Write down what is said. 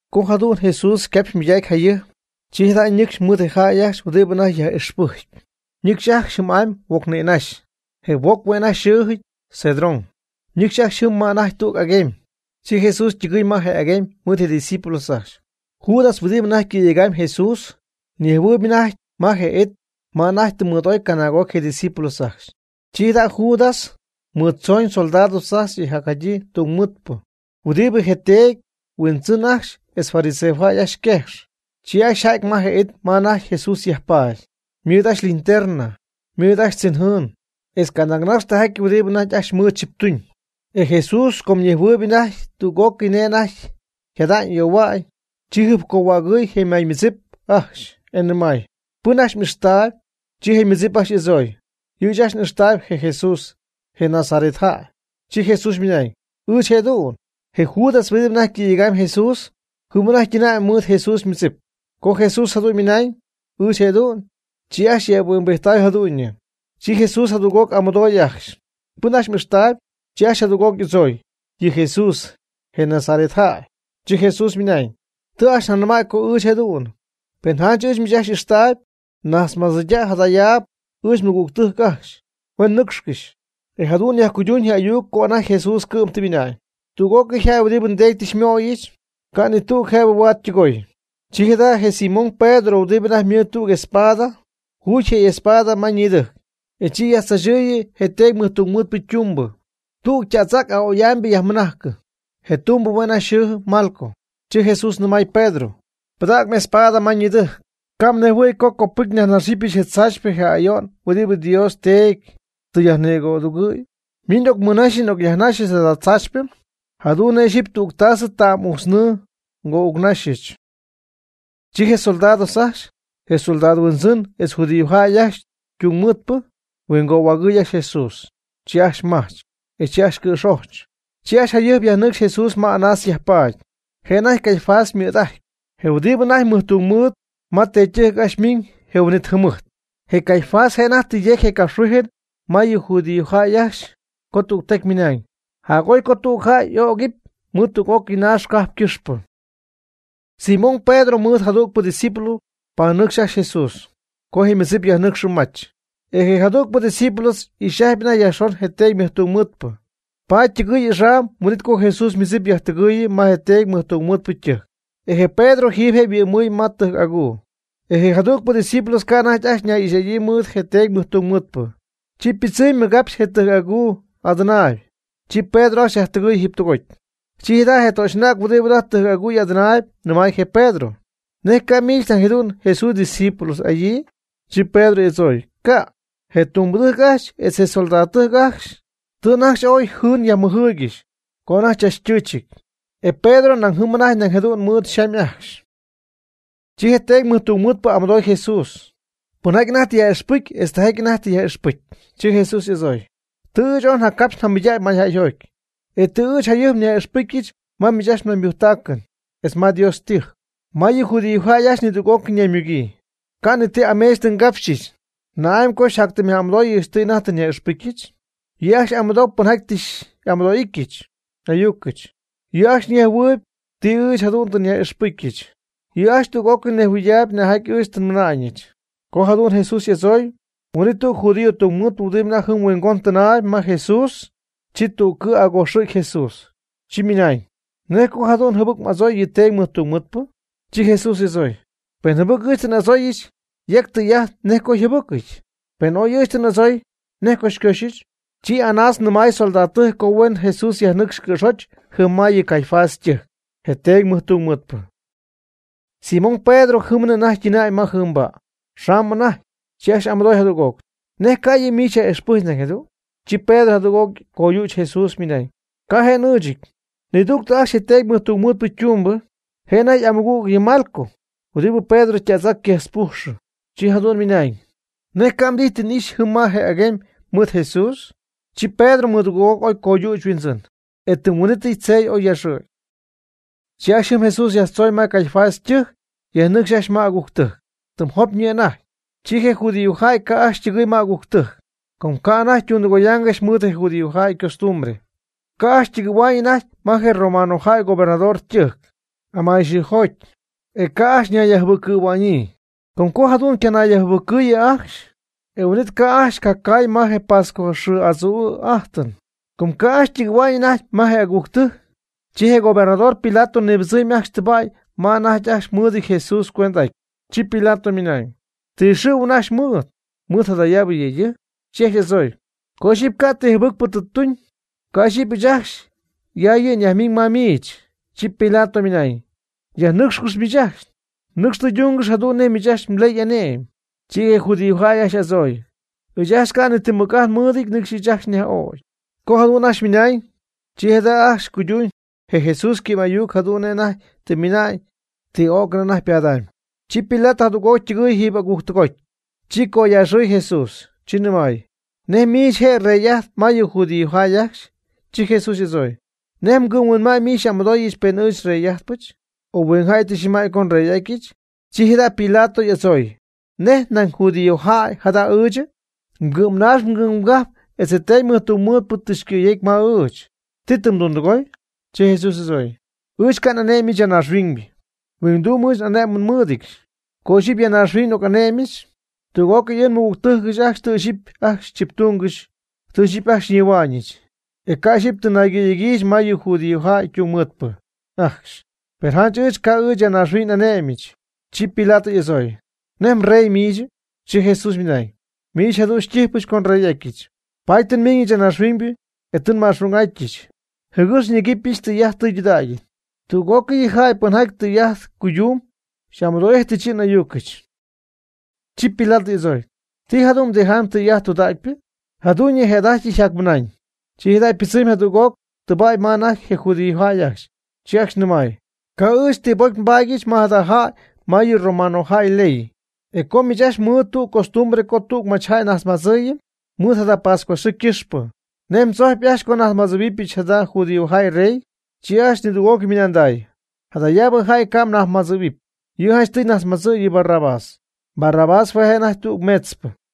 Co jadu'n Jesús ycapxymɨydacy jayɨjp, chi jada' ñɨcxy mɨɨd je jäy ajcxy huɨdibɨ anajty ajcxy yaj'ixpɨjcyp. Ñɨcxy ajcxy jɨm'amy huoc nïnaxy, je huoc hue' anajty xɨɨjɨty Cedrón. Ñɨcxy ajcxy jɨm ma anajty tüg aguemy. Chi Jesús ytɨgɨɨy ma je aguemy mɨɨd ydiscípulos ajcxy. Judas huɨdibɨ anajty cɨ̈yegam Jesús, ñejhuɨɨyb anajty ma je it ma anajty mɨɨd'oy canaag'oc je' ydiscípulos ajcxy. Chi jada' Judas mɨɨddzooñ soldados ajcxy etz jacjadyii tungmɨɨdpɨ huɨdibɨ je teedy yhuindzɨn ajcxy etz fariseojäy ajcxy yquejx. Chi ajcxy yja'ty ma je it ma anajty Jesús yajpaady, ymɨɨd ajcxy linterna, ymɨɨd ajcxy chinjɨɨn etz canaagnax tijaty huɨdibɨ anajty ajcxy mɨɨd chiptuñ. E Jesús com ñejhuɨydaayb anajty tüg'ócɨy nej anajty yjada'ñ y'ayohua'ñ, chi jɨjpcohuägɨy je ymaymɨdzip ajcxy, e nɨmay: ―¿Pɨn ajcxy m'ijxtaayb? Chi je' ymɨdzip ajcxy y'adzooy: ―Yɨ' ɨɨch ajcxy n'ixtaayb je Jesús, je Nazaret jäy. Chi Jesús ymɨnañ: ―Ɨɨch jëdu'n. Je Judas huɨdibɨ anajty cɨ̈yejcp Jesús, jɨm anajty ytɨnäy mɨɨd Jesús ymɨdzip. Co Jesús jadu'n ymɨnañ: “Ɨɨch jëdu'n.” Chi ajcxy yëphuimbijtay jadu'ñyɨ. Chi Jesús jadüg'oc y'amɨdooy ajcxy: ―¿Pɨn ajcxy m'ijxtaayb? Chi ajcxy jadüg'oc y'adzooy: ―Yɨ Jesús, je Nazaret jäy. Chi Jesús ymɨnañ: ―Tɨ ajcxy njanɨmäy co ɨɨch jëdu'n. Pen janch ɨɨch miich ajcxy xy'ijxtaayb, najtzmadzɨydäy jadayaab ɨɨch nmɨgügtɨjc ajcxy, huen nɨcxcɨxy. E jadu'n yajcuyduñ je ayuc co anajty Jesús cɨ'm tɨ ymɨna'ñ: “Tüg'ócɨy jäy huɨdibɨ nDeedy tɨ xymöyɨch, ca' ni tüg jëbɨ huaad ytɨgooy.” Chi jada' je Simón Pedro huɨdibɨ anajty mɨɨd tüg espada, juudy je y'espada ma ñidɨjc, e chi yajtzaachɨɨyɨ je Teedy mɨjtungmɨɨdpɨ ytumbɨ, tüg yta'tz'ac aa'oy'amybɨ yajmɨnájcɨy. Je tumbɨ hue' anajty xɨɨjɨty Malco. Chi Jesús nɨmay Pedro: ―Pɨdäg m'espada ma ñidɨjc. Ca' mnejhuɨ̈y co copɨcy nyajnaxɨpyɨch je tzaachypɨ je ayo'n huɨdibɨ Dios Teedy tɨ xyajnigo'adugɨ̈yɨch. Min n'ocmɨnaxy n'ocyajnaxyɨch jada tzaachypɨ jadu'n nej ixyipy tüg tasɨ ta'm'ujtznɨɨ ngo'uucnaxyɨch. Chi je soldados ajcxy, je soldado yhuindzɨn etz judíojäy ajcxy ytungmɨɨdpɨ huingohuägɨɨy ajcxy Jesús. Chi ajcxy majch, e chi ajcxy cɨ̈xojch. Chi ajcxy jayɨjp yajnɨcxy Jesús ma Anás yajpaady, je' anajty Caifás ymɨ̈d'ajtyp, je huɨdibɨ anajty mɨjtungmɨɨd ma teedytɨjc ajcxy ymiñ je huin'it jɨmɨjt. Je Caifás je' anajty tɨ yecy je capxhuijɨn ma yɨ judíojäy ajcxy co tügtecy ymɨnañ: jac'oy co tüg jäy y'ögɨpy mɨɨd tüg'ócɨy naax cajp ycɨxpɨ. Simón Pedro mɨɨd jadügpɨ ydiscípulo ypanɨcx ajcxy Jesús (co je ymɨdzip yajnɨcxɨ mach). E je jadügpɨ ydiscípulo ixy'ajtɨp anajty yajxon je teedy mɨjtungmɨɨdpɨ, paady ytɨgɨɨy axam huin'it co Jesús ymɨdzip yajtɨgɨɨyɨ ma je teedy mɨjtungmɨɨdpɨ ytɨjc. E je Pedro jiiby je' yhuɨ'mɨy ma tɨjc aguu. E je jadügpɨ ydiscípulo co anajty ajcxy ñay'ixy'adyii mɨɨd je teedy mɨjtungmɨɨdpɨ, chi ypɨdzɨmy mɨgapxy je tɨjc aguu adɨnaayb, chi Pedro ajcxy yajtɨgɨ̈y jiiby tɨgoty. Chi jada' je töxy'anäg huɨdibɨ anajty tɨjc'aguu adɨnaayb, nɨmay je Pedro: ―¿Nej ca' miich nañ jadu'n Jesús xydiscípulo'adyii? Chi Pedro y'adzooy: ―Ca'. Je tumbɨdɨjc ajcxy etz je soldadtɨjc ajcxy tɨ anajty ajcxy oy jɨɨn yajmɨjɨɨygɨxy co anajty chachtɨɨchɨty, e Pedro nañ jɨm anajty nañ jadu'n mɨɨd xamy ajcxy. Chi je teedy mɨjtungmɨɨdpɨ y'amɨdooy Jesús pɨnjaty anajty tɨ yaj'ixpɨcy etz tijaty anajty tɨ yaj'ixpɨcy. Chi Jesús y'adzooy: ―Tɨ ɨɨch oy njacapxy njamɨydägy mayjäyjoty. E tɨ ɨɨch njatyɨmy nyaj'ixpɨcyɨch ma miich ajcxy mnaymujctacɨn etz ma Dios ytɨjc, ma yɨ judiojäy ajcxy nidüg'ócɨy ñaymugyii. Ca' ni ti ameech tɨ nnigapxyɨch. ¿Na'amy co xyjactɨm'amɨdooyɨch ti anajty tɨ nyaj'ixpɨcyɨch? Yɨ' ajcxy amɨdou pɨnjaty tɨ xy'amɨdo'ijtɨch n'ayucɨch, yɨ' ajcxy nejhuɨɨyb ti ɨɨch jadu'n tɨ nyaj'ixpɨcyɨch. Yɨ' ajcxy tüg'ócɨy ñejhuɨydaayb nejjaty ɨɨch tɨ nmɨna'ñɨch. Co jadu'n y'adzooy Jesús, huin'it tüg judío tungmɨɨdpɨ huɨdibɨ anajty jɨm huingon tɨnaayb ma Jesús, chi tüg cɨ' acojxɨ̈gy Jesús, chi mɨnañ: ―¿Nej co jadu'n jɨbɨc m'adzooy yɨ teedy mɨjtungmɨɨdpɨ? Chi Jesús y'adzooy: ―Pen jɨbɨc ɨɨch tɨ n'adzooy yec tɨy'ajt nej co yjɨbɨcɨty. Pen oy ɨɨch tɨ n'adzooy, ¿nej co xycoxyɨch? Chi Anás nɨmay soldadtɨjc co huen Jesús yajnɨcxy cɨ̈xoch jɨm ma yɨ Caifás ytɨjc, je teedy mɨjtungmɨɨdpɨ. Simón Pedro jɨmnɨ anajty ytɨnäy ma jɨɨmba' yxamy anajty, chi ajcxy amɨdoy jadüg'oc: ―¿Nej cay yɨ' miich xyaj'ixpɨjcp nañ jadu'n? Chi Pedro jadüg'oc coyüch Jesús ymɨnañ: ―Ca' je' n'ɨɨchɨty. Nidügtɨ ajcxy je teedy mɨjtungmɨɨdpɨ ytumbɨ, je' anajty y'amɨgüg yɨ Malco, huɨdibɨ Pedro yta'tz'ac quejtzpujxɨ, chi jadu'n ymɨnañ: ―¿Nej ca' mdijy n'ijxyɨ jɨm ma je aguemy mɨɨd Jesús? Chi Pedro mɨdugɨɨg'oc oy coyüch yhuindzɨn, e tɨm huin'itɨy tzey oy yaaxɨ̈gy. Chi ajcxy jɨm yajtzooñ Jesús ma Caifás ytɨjc yajnɨcxy ajcxy ma agujctɨjc, tɨm jopyñɨ anajty. Chi je judiojäy ca' ajcxy ytɨgɨɨy ma agujctɨjc, com ca' anajty ytundɨgoyaangɨxy mɨɨd judiojäy ycostumbre. Ca' ajcxy ytɨgɨ̈hua'ñ anajty ma je romanojäy gobernador ytɨjc amayxɨɨjoty, e ca' anajty ajcxy ñayyajjɨbɨccɨ̈hua'ñyii. Com co jadu'n ycanayyajjɨbɨccɨyɨ ajcxy, e huin'it ca' ajcxy ycacaay ma je pascua xɨɨ adzuu'ajtɨn. Co ca' ajcxy ytɨgɨ̈hua'ñ anajty ma je agujctɨjc, chi je gobernador Pilato nibɨdzɨmy ajcxy tɨba'y ma anajty ajcxy mɨɨdɨty Jesús cuend'aty. Chi Pilato ymɨnañ: ―¿Ti xɨ̈huɨn ajcxy mmɨɨd, mɨɨd jadayaabɨ yëydɨjc? Chi ajcxy y'adzooy: ―Co ixyipy ca' ti jɨbɨcpɨ tuñ, ca' ixyipy ɨɨch ajcxy ya yɨ' nyajmiñ ma miich. Chi Pilato ymɨnañ: ―Yajnɨcxcɨx miich ajcxy. Nɨcx tɨydungɨx jadu'n nej miich ajcxy mley y'ané'my. Chi je judíojäy ajcxy y'adzooy: ―Ɨɨch ajcxy ca' ni ti mɨc'ajt nmɨɨdɨty nɨcxy ɨɨch ajcxy njäyyaj'ögy. Co jadu'n ajcxy ymɨnañ, chi jadu'n ajcxy cuyduñ je Jesús ycɨ'm'ayuc jadu'n nej anajty tɨ ymɨna'ñ ti o'cɨn anajty ypadamy. Chi Pilato jadüg'oc ytɨgɨɨy jiiby agujctɨgoty, chi coyaaxɨɨy Jesús, chi nɨmay: ―¿Nej miich je' rey'ajtp ma yɨ judíojäy ajcxy? Chi Jesús y'adzooy: ―¿Nej mgɨ'mhuinma'ñ mɨɨd xy'amɨdooyɨch pen ɨɨch nrey'ajtpɨch, o huingjäy tɨ xyajnɨmäy co nrey'atyɨch? Chi jada' Pilato y'adzooy: ―¿Nej nañ judiojäy jada' ɨɨchɨ? Mgɨ'mnaax mgɨ'mgajp etz je teedy mɨjtungmɨɨdpɨ tɨ xycɨ̈yecy ma ɨɨch. ¿Ti tɨ mdundɨgooy? Chi Jesús y'adzooy: ―Ɨɨch ca' n'ane'myɨch ya naaxhuiñ. Huingduum ɨɨch n'ané'mɨn nmɨɨdɨdyɨch. Co ixyipy ya naaxhuiñ n'oc'ane'myɨch, tüg'ócɨy ɨɨch nmɨgügtɨjc ajcxy tɨ ixyipy ajcxy tziptungɨxy, tɨ ixyipy ajcxy xyñihua'ñɨch. E ca' ixyipy tɨ naygɨ̈yegyiijɨch ma yɨ judíojäy tungmɨɨdpɨ ajcxy. Per janch ɨɨch ca' ɨɨch ya naaxhuiñ n'ane'myɨch. Chi Pilato y'adzooy: ―¿Nej mrey miichɨ? Chi Jesús ymɨnañ: ―Miich jadu'n xytijypɨch co nrey'atyɨch. Paady tɨ nmiñɨch ya naaxhuiñ, e tɨ nma'xung'atyɨch, jɨgɨx nyecyɨch tɨy'ajt tɨydudägy. Tüg'ócɨy yɨ jäy pɨnjaty tɨy'ajt cuydumb xy'amɨdo'íjtɨbɨch yɨ' n'ayucɨch. Chi Pilato y'adzooy: ―¿Ti jadu'n mdijy tɨy'ajt tɨydudägypɨ? Jadu'ñyɨ je' jada'ajty yjacmɨnañ, chi pɨdzɨmy jadüg'oc tɨba'y ma anajty je judíojäy ajcxy. Chi ajcxy nɨmay: ―Ca' ɨɨch ni ti bocy nbaadyɨch ma jada jäy ma yɨ romanojäy yley. E com miich ajcxy mɨɨd tüg costumbre co tüg nnajtzmadzɨɨyɨm machyjäy mɨɨd jada pascua xɨɨ ycɨxpɨ, ¿nej mdzojcyp ajcxy co nnajtzmadzɨ̈huɨbyɨch jada judíojäy reyɨ? Chi ajcxy nidüg'ócɨy mɨnanday: ―Jadayaabɨ jäy ca' mnajtzmadzɨ̈huɨpy, yɨ' janchtɨy mnajtzmadzɨ' yɨ Barrabás. Barrabás hue' je' anajty tüg meetzpɨ.